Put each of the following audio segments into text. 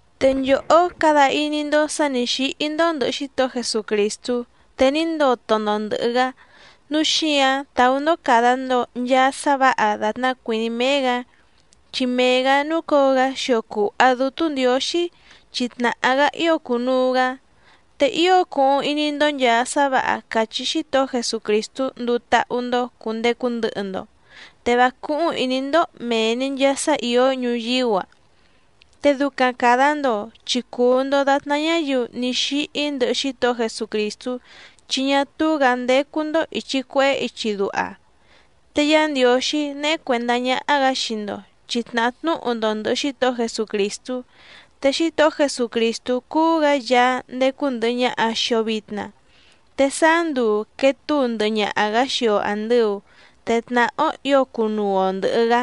Te nchòhó cada iní‑ndó sǎ nǐ xíhí‑ndó ndɨ̀hɨ Xítohó Jesucrìstú te ní ndoto‑ndo ndɨ̀hɨ‑gá, núu xíǎⁿ tàú‑ndó càda‑ndo nchaa sá vǎha dàtná cuìní méé‑gǎ chi mee‑gǎ núcǒo‑gá xio cùha Dútú Ndiǒxí chi tnàhá‑gá ío cùnuu‑gá. Te ío cuhuⁿ iní‑ndó nchàa sá vǎha càchí Xítohó Jesucrìstú nduu táhú‑ndó cùndecu ndɨhɨ‑ndo, te vá cúhúⁿ ìní‑ndó mèe‑ni nchaa sá ìó ñuyíú‑a. Te ducaⁿ càda‑ndo chi cùu‑ndo datná ñáyiu ní xíhí ndɨhɨ Xítohó Jesucrìstú, chi ñá túú‑gǎ ndécú‑ndó ìchi cuehé ichi duha. Te Yá Ndiǒxí néhé cuèndá ñáhá‑gǎ xii‑ndo chi tnàhá tnúhu‑ndo ndɨ̀hɨ Xítohó Jesucrìstú. Te Xítohó Jesucrìstú cúú‑gǎ Yaá ndécú ndɨ̀hɨ ñaha xii‑o vitna, te sáá nduu quèe túu ndɨhɨ ñaha‑gǎ xii‑o àndɨu, te tnàhá‑ó ǐo cunuu‑o ndɨ̀hɨ‑gá.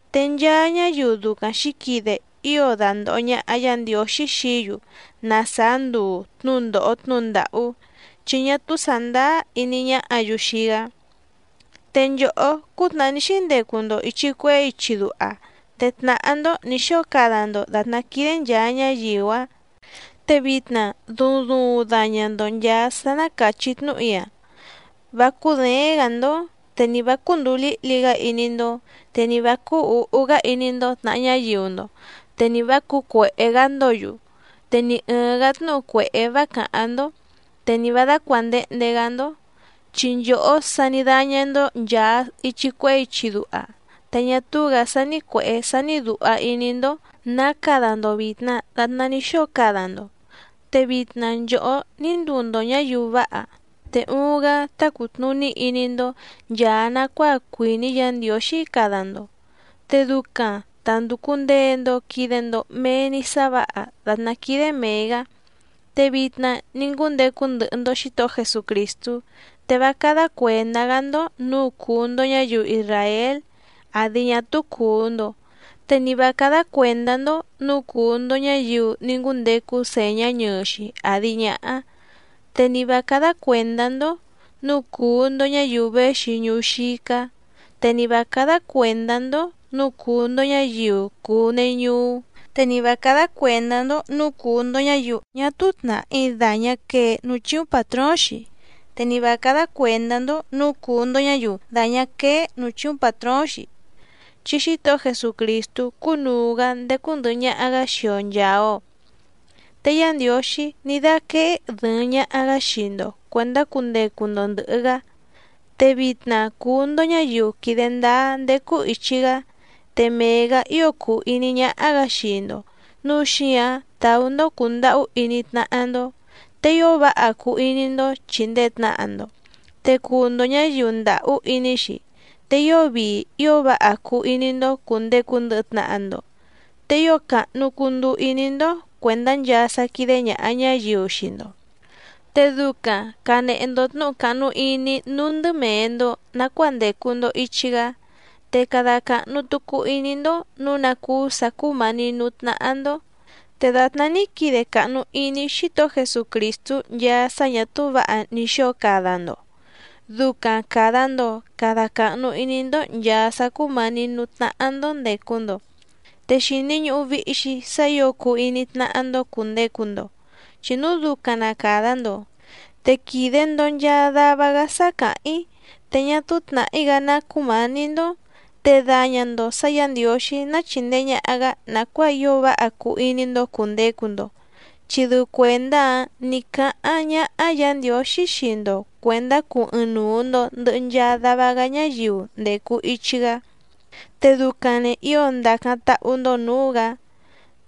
Te nchaa ñáyiu ducaⁿ xǐquide ío dandòho ñaha Yá Ndiǒxí xií‑yu na sàá nduu tnúndòho tnúhu ndàhú, chi ñá túú sàndáá iní ñáhǎ‑yu xii‑gá. Te nchòhó cútnàhá ní xíndecu‑ndo ìchi cuehé ichi duha, te tnàhá‑ndó nǐ xóo cada‑ndo dàtná quídé nchàa ñáyiu‑áⁿ. Te vitna duuⁿ duuⁿ daña‑ndo nchàa sá ná càchí tnúhu‑í‑a: Vá cúděéⁿ‑gǎ‑ndó, te ni vǎ cúndùu líhli‑gá iní‑ndó, te ni vǎ cúú ǔhú‑gá iní‑ndó tnàha ñáyiu‑ndo, te ni vǎ cǔcuèhé‑gá‑ndǒ‑yu, te ni ɨ̀ɨⁿ‑gá tnúhu cuèhé vá càháⁿ‑ndó. Te ni vǎ dácuàndehnde‑gá‑ndó, chi nchòhó sa ní dáñá‑ndó nchàa ichi cuehé ichi duha, te ñá túú‑gǎ sání cuèhé sání dùha iní‑ndó nǎ cada‑ndo vìtna datná ní xóo cada‑ndo. Te vitna nchòhó ní nduu‑ndo ñǎyiu váha, te uuⁿ‑gá tá cùtnuní iní‑ndó nchàa nacuáa cuìní Yǎ Ndiǒxí cada‑ndo, te ducaⁿ ta ndùcu ndee‑ndo quide‑ndo mee‑ni sá vǎha dàtná quídé mèe‑gá. Te vitna ní ngúndecu ndɨhɨ‑ndo Xǐtohó Jesucrìstú, te vá cádá cuèndá‑gá‑ndó nǔu cùu‑ndo ñáyiu isràél àdi ñá túú cùu‑ndo, te ni vǎ cádá cuèndá‑ndó nǔu cùu‑ndo ñáyiu ní ngúndecu sèñá ñɨɨ‑xi àdi ñáhá, te ni vǎ cádá cuèndá‑ndó nǔu cùu‑ndo ñáyiu véxi ñuú xícá, te ni vǎ cádá cuèndá‑ndó nǔu cùu‑ndo ñáyiu cùu neñuú, te ni vǎ cádá cuèndá‑ndó nǔu cùu‑ndo ñáyiu ñá túú tnàhí dàñá quee núú chíúⁿ pàtróóⁿ‑xi, te ni vǎ cádá cuèndá‑ndó nǔu cùu‑ndo ñáyiu dàñá quéé nǔú chíúⁿ pàtróóⁿ‑xi, chi Xítohó Jesucrìstú cúnùu‑gá ndécú ndɨ̀hɨ ñaha‑gá xii‑o nchàa‑o. Te Yá Ndiǒxí ní dáquéé dɨ̀ɨⁿ ñaha‑gá xii‑ndo cuèndá cundecu‑ndo ndɨ̀hɨ‑gá, te vitna cùu‑ndo ñáyiu quìde ndáá ndécú ìchi‑gá. Te mee‑gǎ ío cùu iní ñáhá‑gǎ xii‑ndo nǔu xíǎⁿ tàú‑ndó cùndahú iní tnáhá‑ndó, te ío váha cuu iní‑ndó chìndee tnaha‑ndo, te cuu‑ndo ñǎyiu ndàhú iní‑xi, te ío vii ío váha cuu iní‑ndó cùndecu ndɨhɨ tnaha‑ndo, te ío càhnu cunduu iní‑ndó cuèndá nchaa sá quídé ñàha ñáyiu xii‑ndo. Te ducaⁿ cànehe‑ndo tnúhu càhnu iní núú ndɨ mèe‑ndo nacuáa ndècu‑ndo ichi‑gá, te cada càhnu tucu iní‑ndó nǔu ná cúú sǎ cúmǎní nǔú tnáhá‑ndó. Te dàtná ní quide càhnu iní Xítohó Jesucrìstú nchaa sá ñà túú vǎha ní xóo cada‑ndo ducaⁿ càda‑ndo cada cahnu iní‑ndó nchàa sá cúmǎní nǔú tnáhá‑ndó ndècu‑ndo. Te xìni ñuhu vihi‑xi sá ǐo cuu iní tnáhá‑ndó cùndecu‑ndo, chi núu ducaⁿ na càda‑ndo, te quìde‑ndo nchaa dava‑gá sá càháⁿ‑í, te ñá túú tnàhí‑gá ná cúmǎní‑ndó. Te daña‑ndo sǎ Yǎ Ndiǒxí ná chìndee ñaha‑gá nàcuáa ío váha cuu iní‑ndó cùndecu‑ndo, chi dɨu cuèndá‑áⁿ nǐ cáháⁿ ñáhá Yǎ Ndiǒxí xii‑ndo cuèndá cuu ɨɨⁿnuu‑ndo ndɨ̀hɨ nchaa dava‑gá ñáyiu ndècu ichi‑gá, te ducaⁿ‑ni ǐo ndacáⁿ táhú‑ndó nǔú‑gǎ.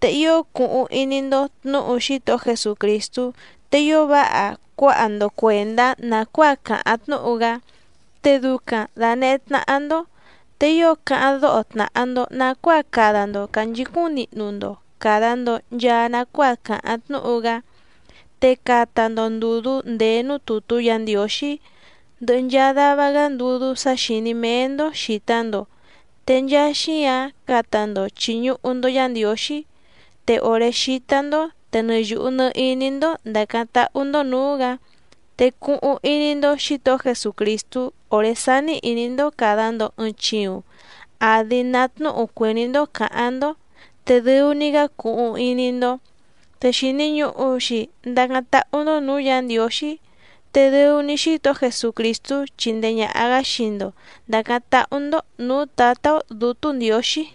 Te ío cuhuⁿ iní‑ndó tnǔhu Xítohó Jesucrìstú, te ío váha cuáha‑ndo cuèndá nàcuáa càháⁿ tnúhu‑gá te ducaⁿ dànehé tnáhá‑ndó. Te ío cáháⁿ dóho tnàha‑ndo nacuáa cada‑ndo cànchicúⁿ nihnu‑ndo càda‑ndo nchaa nacuáa càháⁿ tnúhu‑gá, te cata‑ndo ndùdú ndèé núú tùtú Yǎ Ndiǒxí, ndɨhɨ nchaa dava‑gá ndudú sá xìní méé‑ndó xìta‑ndo te nchaa xíǎⁿ cata‑ndo chìñuhu‑ndo Yá Ndiǒxí. Te òré xítá‑ndó te nɨ yùhu nɨ iní‑ndó ndàcáⁿ táhú‑ndó nǔú‑gǎ. Te cuhuⁿ iní‑ndó Xǐtohó Jesucrìstú òré sání ìní‑ndó càda‑ndo ɨɨⁿ chiuⁿ àdi ná tnúhu cuìní‑ndó cǎháⁿ‑ndó, te dɨu‑ni‑gá cuhuⁿ iní‑ndó. Te xìni ñuhu‑xi ndacáⁿ táhú‑ndó nǔú Yǎ Ndiǒxí, te dɨu‑ni Xítohó Jesucrìstú chindee ñàha‑gá xii‑ndo ndàcáⁿ táhú‑ndó nǔú Tǎtá‑ó Dǔtú Ndiǒxí.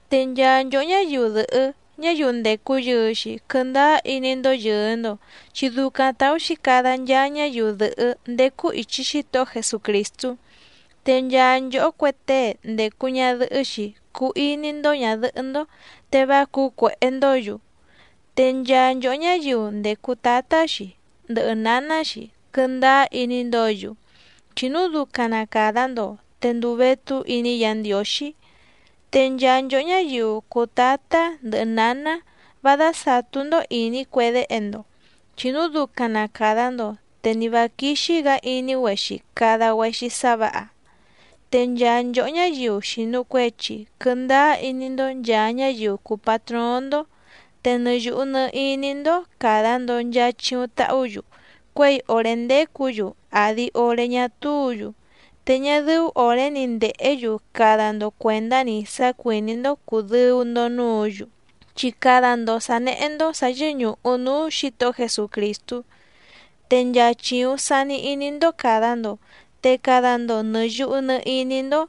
Te nchaa nchòhó ñáyiu dɨ̀hɨ́ ñáyiu ndècu yɨɨ‑xi quɨndáá iní‑ndó yɨ̀ɨ‑ndo, chi ducaⁿ tàú‑xi cada nchaa ñáyiu dɨ̀hɨ́ ndécú ìchi Xítohó Jesucrìstú. Te nchaa nchòhó cue tée ndècu ñadɨhɨ́‑xi cuu iní‑ndó ñàdɨhɨ́‑ndó, te vá cǔcuèhé‑ndǒ‑yu. Te nchaa nchòhó ñáyiu ndècu tátá‑xi ndɨhɨ nǎná‑xi quɨndáá iní‑ndǒ‑yu, chi núu ducaⁿ na càda‑ndo te ndùu vétú iní Yǎ Ndiǒxí. Te nchaa nchòhó ñáyiu cùu tátá ndɨhɨ nǎná vá dásàtú‑ndó ìní cue déhe‑ndo, chi núu ducaⁿ na càda‑ndo te ni vǎ quíxí‑gǎ iní‑güexi cada‑güexi sá vǎha. Te nchaa nchòhó ñáyiu xìnu cuechi quɨndáá iní‑ndó nchàa ñáyiu cùu patróóⁿ‑ndó, te nɨ yùhu nɨ iní‑ndó càda‑ndo nchaa chiuⁿ tahú‑yu cuěi òré ndécǔ‑yu àdi oré ñá túǔ‑yu, te ñá dɨ́ú òré‑ni ndèhé‑yu cada‑ndo cuèndá‑ni sá cuìní‑ndó cùdɨu‑ndo núǔ‑yu, chi cada‑ndo sǎ néhé‑ndó sà yɨ́ñùhu núú Xǐtohó Jesucrìstú. Te nchaa chìuⁿ sani iní‑ndó càda‑ndo te cada‑ndo nɨ̀ yuhu nɨ iní‑ndó,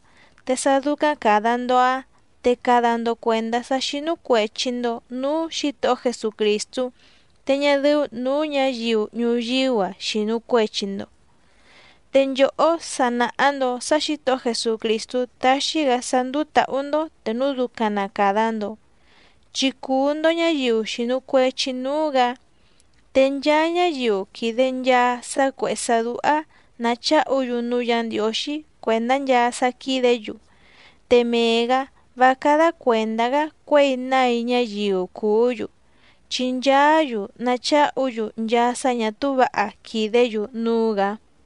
te sá dúcáⁿ càda‑ndo‑áⁿ te cada‑ndo cuèndá sá xínú cuèchi‑ndo núú Xǐtohó Jesucrìstú te ñá dɨ́ú nǔú ñǎyiu ñuyíú‑a xìnu cuechi‑ndo. Te nchòhó sa nàha‑ndo sá Xǐtohó Jesucrìstú taxi‑gá sá ndúú tǎhú‑ndó te núu ducaⁿ na càda‑ndo, chi cùu‑ndo ñáyiu xìnu cuechi núú‑gǎ. Te nchaa ñáyiu quìde nchaa sá cuèhé sá dúhá nàcháhu‑yu núú Yǎ Ndiǒxí cuèndá nchaa sá quídě‑yu, te mee‑gǎ vá cádá cuèndá‑gá cuěi nái ñáyiu cùú‑yu, chi nchaá‑yu nacháhu‑yu nchaa sá ñà túú vǎha quìdé‑yu núú‑gǎ.